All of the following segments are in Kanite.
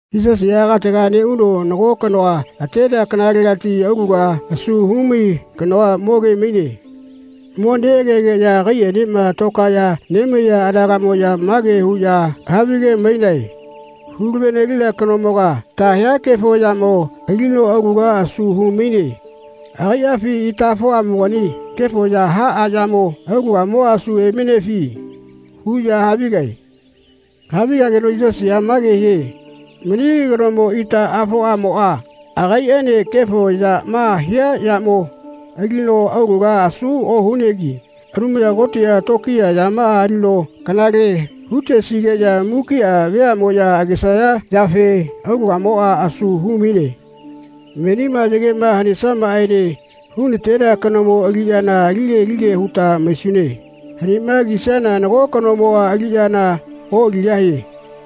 Yisasiꞌa katega neꞌuno nago kanoa atenea kanalegati aulaga asu humai kano moge-maine. Mo neꞌagegeꞌya agaiꞌaenema tokaeꞌya nemaiya anagaꞌmoꞌya mage huꞌya havige-mainae “Hula-ve-nelina kanomoga ta hia kefo yamo alino aulaga asu hu-maine akaiꞌafi itaꞌafoꞌamoꞌa kefo ya haꞌa yamo aulagamoꞌa asu hu-mainefi?” huꞌya havigae. Havigageno Yisasiꞌa mage hie “Mani kanomo itaꞌafoꞌamoꞌa akaiꞌaene kefo yama hia yamo alino aulaga asu ohunegi Anumaya Kotiꞌa tokiya yamaꞌa alino kanale hu-tesigeꞌya mukiꞌa veaꞌmoꞌya agesaya yafe aulagamoꞌa asu hu-maine. Menima yagema hanesiamaꞌaene hu-natenea kanomo aliꞌyana alige alige huta maisune. Hanima kisiana nago kanomoꞌa aliꞌyana oꞌaligahie.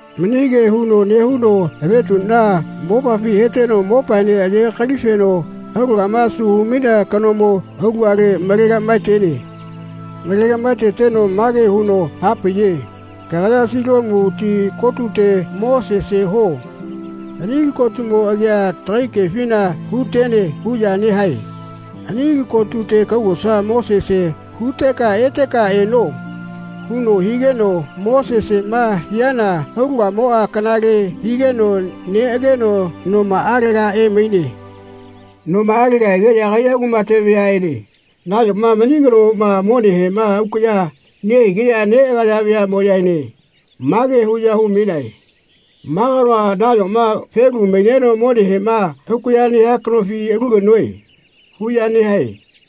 Mani kea huno nehuno avetuꞌna mopafi heteno mopaene ayegakalifeno aulagama asu hu-mainea kanomo aulagale malegaꞌmaetene. Malegaꞌmaeteteno mage huno hapaiye “Kagaya Siloamu ti kotute mo sese huo. Ani li kotumo agia tagai kefina ‘Hu-tene.’ huꞌya nehae. Ani li kotute kaugosa mo sese huteka eteka eno.” huno higeno mo seseꞌma hiana aulagamoꞌa kanale higeno neꞌageno nomaꞌalega emaine. Nomaꞌalega egeꞌya agaiꞌa kumate vayaꞌene nayoma mani kanomoꞌa monehema aukaꞌya nehigeꞌya neꞌagaya veaꞌmoꞌyaene mage huꞌya hu-mainae “Ma kanoa nayoma felu maineno monehema aukaꞌya nehia kanofi alu kanoe?” huꞌya nehae.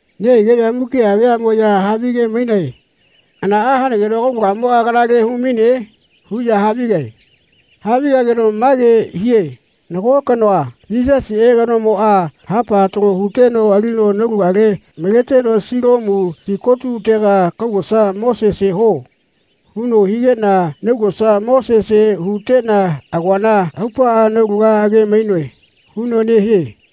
Nehigeꞌya mukiꞌa veaꞌmoꞌya havige-mainae “Hanaꞌa hanageno kaulagamoꞌa kanale hu-maine?” huꞌya havigae. Havigageno mage hie “Nago kanoa, Yisasiꞌe kanomoꞌa, hapa talo huteno alino naulagale maleteno ‘Siloamu ti kotutega kaugosa mo sese huo.’ huno higeꞌna naugosa mo sese huteꞌna agoana aupaꞌa naulaga age-mainoe.” huno nehie.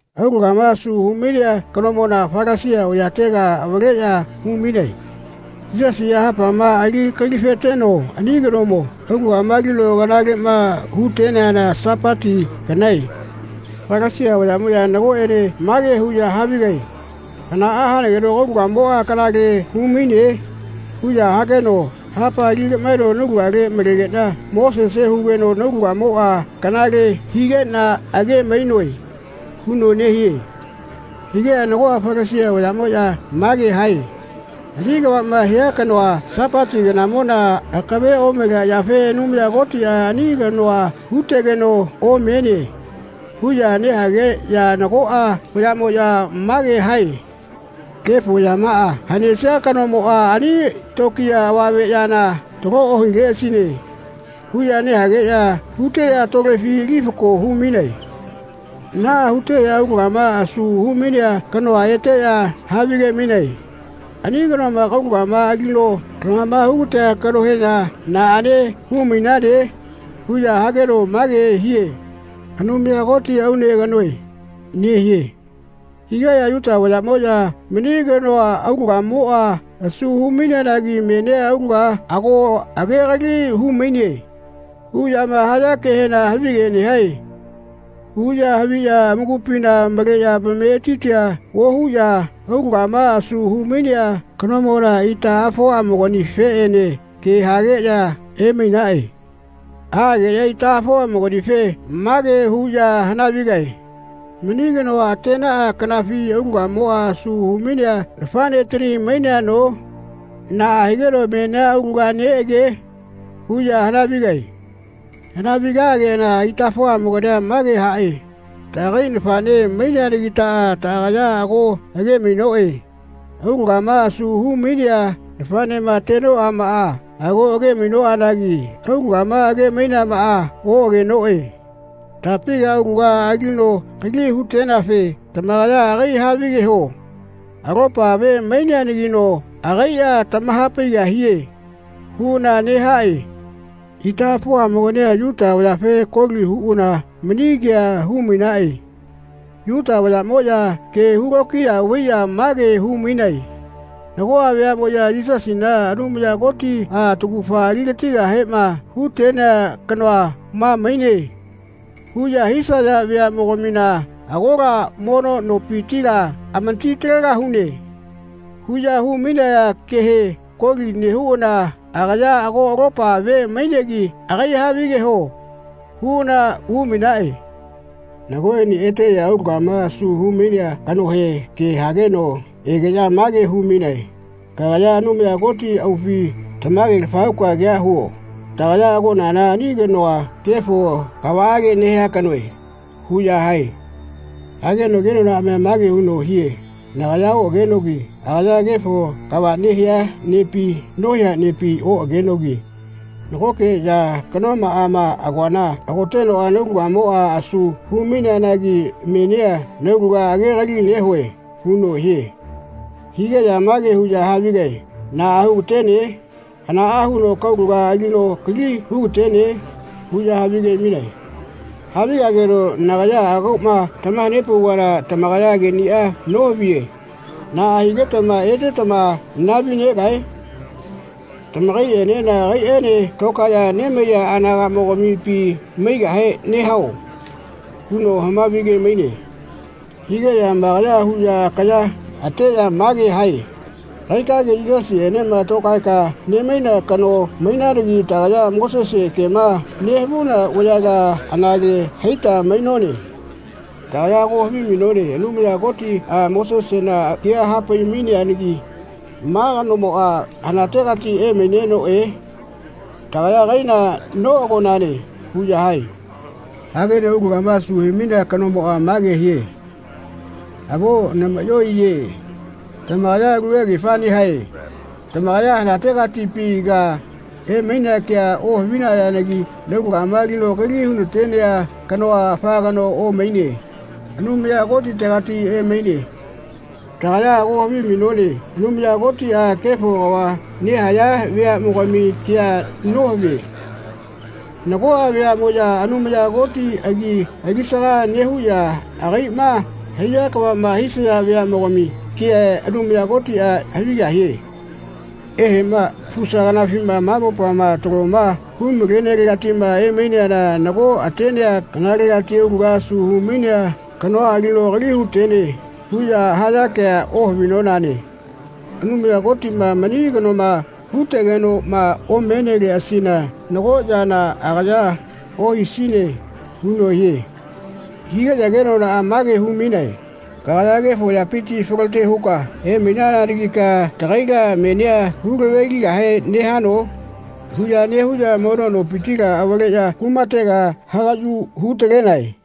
Aulagama asu hu-mainea kanomona Falasia vayatega avaleꞌya umainae. Yisasiꞌa hapama ali gakalifeteno ani kanomo aulagama alino kanaleꞌma hu-teneana Sapati kanae. Falasia vayaꞌmoꞌya nagoꞌene mage huꞌya havigae “Hanaꞌa hanageno kaulagamoꞌa kanale hu-maine?” huꞌya hageno “Hapa ali gaꞌmaeno naulagale malegeꞌna mo sese hugeno naulagamoꞌa kanale higeꞌna age-mainoe.” huno nehie. Higeꞌya nagoꞌa Falasia vayaꞌmoꞌya mage hae “Ani kavaꞌma hia kanoa Sapati kanamona akave omalea yafe Anumaya Kotiꞌa ani kanoa hu-tegeno omene.” huꞌya nehageꞌya nagoꞌa vayaꞌmoꞌya mage hae “Kefo yamaꞌa hanesia kanomoꞌa ani tokiya avame yana talo ohileꞌasine.” huꞌya nehageꞌya huteꞌya tolefi ali fako hu-mainae. Naꞌa huteꞌya aulagama asu hu-mainea kanoa eteꞌya havige-mainae “Ani kanoma kaulagama alino lamama hu-gatea kanohena naꞌane hu-mainane?” huꞌya hageno mage hie “Anumaya Koti aune kanoe.” nehie. Higeꞌya Yuta vayaꞌmoꞌya “Mani kanoa aulagamoꞌa asu hu-maineanagi menia aulaga ago agegali hu-maine.” huꞌyama haya kehena “Havige nehae.” huꞌya haviꞌya amakupina maleꞌya amametitia ohuꞌya aulagama asu hu-mainea kanomona itaꞌafoꞌamoganifeꞌene ke hageꞌya emainaꞌe. Aꞌageꞌya itaꞌafoꞌamoganife mage huꞌya hana-vigae “Mani kanoa atenaꞌa kanafi aulagamoꞌa asu hu-mainea nafaꞌnetani maineano? Naꞌa higeno menia aulaga neꞌage?” huꞌya hana-vigae. Hanavi-gageꞌana itaꞌafoꞌamogania mage haꞌe “Taꞌagai nafaꞌne maineanagitaꞌa taꞌagaya ago age-mainoꞌe. Aulagama asu hu-mainea nafaꞌnema atenoꞌamaꞌa ago age-mainoꞌanagi aulagama age-maineamaꞌa oꞌagenoꞌe. Tapiga aulaga alino kali hu-teneafe tamakaya agai havigeho. Alopa ve maineanagino agaiꞌa tamaha-paigahie.” huꞌana nehaꞌe. Itaꞌafoꞌamogania Yuta vayafe koli huꞌana mani kea hu-mainaꞌe. Yuta vayaꞌmoꞌya kea hu-lokiya vaiꞌya mage hu-mainae “Nagoꞌa veaꞌmoꞌya ‘Yisasina Anumaya Kotiꞌa taugafa ali-gatigahema hu-tenea kanoa ma maine.’ huꞌya hisaya veaꞌmogamina agola mono nopitila amati-talegahune.” huꞌya hu-mainaya kehe koli nehuꞌana “Agaya alopa ve mainegi agai havigeho.” huꞌana hu-mainaꞌe. Nagoꞌene eteꞌya aulagama asu hu-mainea kanohe ke hageno egeꞌya mage hu-mainae “Kagaya Anumaya Koti aufi tamage-lafa huka kea huo. Tagaya agonana ani kanoa kefo kavaꞌage nehia kanoe.” huꞌya hae. Hageno kenonaꞌamia mage huno hie “Nagaya oꞌagenogi agaya kefo kava nehia nepi nohia nepi oꞌagenogi nagokeꞌya kanoꞌama agoana hagotenoꞌa naulagamoꞌa asu humaineanagi menia naulaga agegali nehue.” huno hie. Higeꞌya mage huꞌya havigae “Naꞌa hu-ga-tene? Hanaꞌa huno kaulaga alino kali hu-ga-tene?” huꞌya havige-mainae. Havigageno “Nagaya agoꞌma tamaha-nepauvana tamakaya keꞌniꞌa nohaviye. Naꞌa higetama etetama nahavi-negae? Tamakaiꞌenena agaiꞌaene tokaeꞌya nemaiya anagaꞌmogamipi maigahe nehao?” huno havige-maine. Higeꞌya amakaya huꞌya akaya ateꞌya mage hae “Kagaikage Yisasienema tokaeka nemaina kanoa mainanagi tagaya Mosese kema nehavuna vayala anale haita mainone. Tagaya ago havimainone Anumaya Kotiꞌa Mosesena kea hapai-maineanagi ma kanomoꞌa hanategati emainenoꞌe tagaya agaila noꞌagonane.” huꞌya hae. Hageno aulagama asu hu-mainea kanomoꞌa mage hie “Avo namaꞌyo neꞌaiye. Tamakaya alu kegefa nehae. Tamakaya hanategatipiga emainea ke ohavinayanagi naulagama alino kali hu-na-tenea kano afa kanoa omaine. Anumaya Kotitegati emaine. Tagaya ago havimainone Anumaya Kotiꞌa kefo kava nehaya veaꞌmogami kea nohavie. Nagoꞌa veaꞌmoꞌya Anumaya Koti agi alisaga nehuꞌya agaiꞌma haiya kavaꞌma hisaya veaꞌmogami kea Anumaya Kotiꞌa havigahie. Eheꞌma fusa kanafima ma mopama taloma hu-malenelegatiꞌma emaineana nago atenea kanalegati aulaga asu hu-mainea kanoa alino kali hu-tene huꞌya haya kea ohavinonane. Anumaya Kotiꞌma mani kanoma hu-tegenoꞌma omeneleꞌasina nago yana agaya ohisine.” huno hie. Higeꞌya kenonaꞌa mage hu-mainae “Kagaya kefo yapiti falote huka emainananagika tagaila menia hu-lave-ligahe nehano?” huꞌya nehuꞌya mono nopitila avaleꞌya kumatega hagaꞌyu hu-talenae.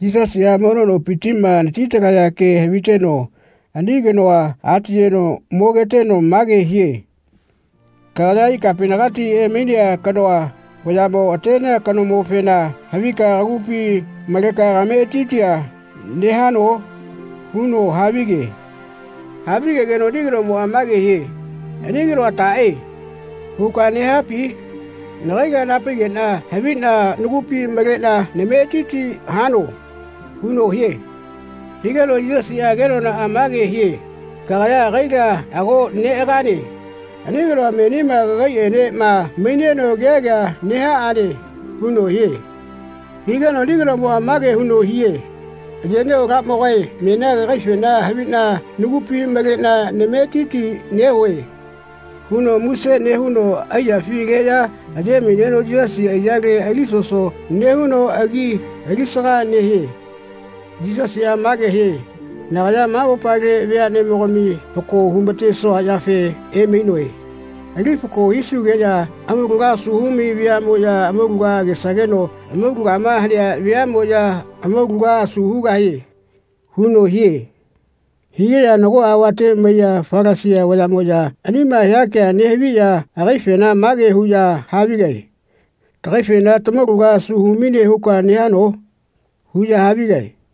Yisasiꞌa mono nopitiꞌma anati-talaya kea haviteno ani kanoa atiyeno mogeteno mage hie “Kagaya ikapinagati emainea kanoa vayaꞌmo atenea kanomofena havika kagupi maleka kametitia nehano?” huno havige. Havigegeno ani kanomoꞌa mage hie “Ani kanoa taꞌe? huka nehapi? Nagaila naha-paigeꞌna haviꞌna nagupi maleꞌna nametiti hano.” huno hie. Higeno Yisasiꞌa kenonaꞌa mage hie “Kagaya agaila ago neꞌagane. Ani kanoa menima kagaiꞌenema maineno kea kea nehaꞌane.” huno hie. Higeno ani kanomoꞌa mage huno hie “Ayeꞌnio Alamogae menia kagaifena haviꞌna nagupi maleꞌna nametiti nehue.” huno muse nehuno aiyafi aleꞌya aye-maineno Yisasi aiyale ali-soso nehuno agi alisaga nehie. Yisasiꞌa mage hie “Nagaya ma mopale veaꞌmogami fako hu-ma-tesua yafe emainoe. Ali fako hisugeꞌya amaulaga asu humai veaꞌmoꞌya amaulaga agesageno amaulagama hanea veaꞌmoꞌya amaulagama asu hugahie.” huno hie. Higeꞌya nagoꞌa avate maiya Falasia vayaꞌmoꞌya anima hia kea nehaviꞌya agaifena mage huꞌya havigae “Tagaifena tamaulaga asu hu-maine huka nehano?” huꞌya havigae.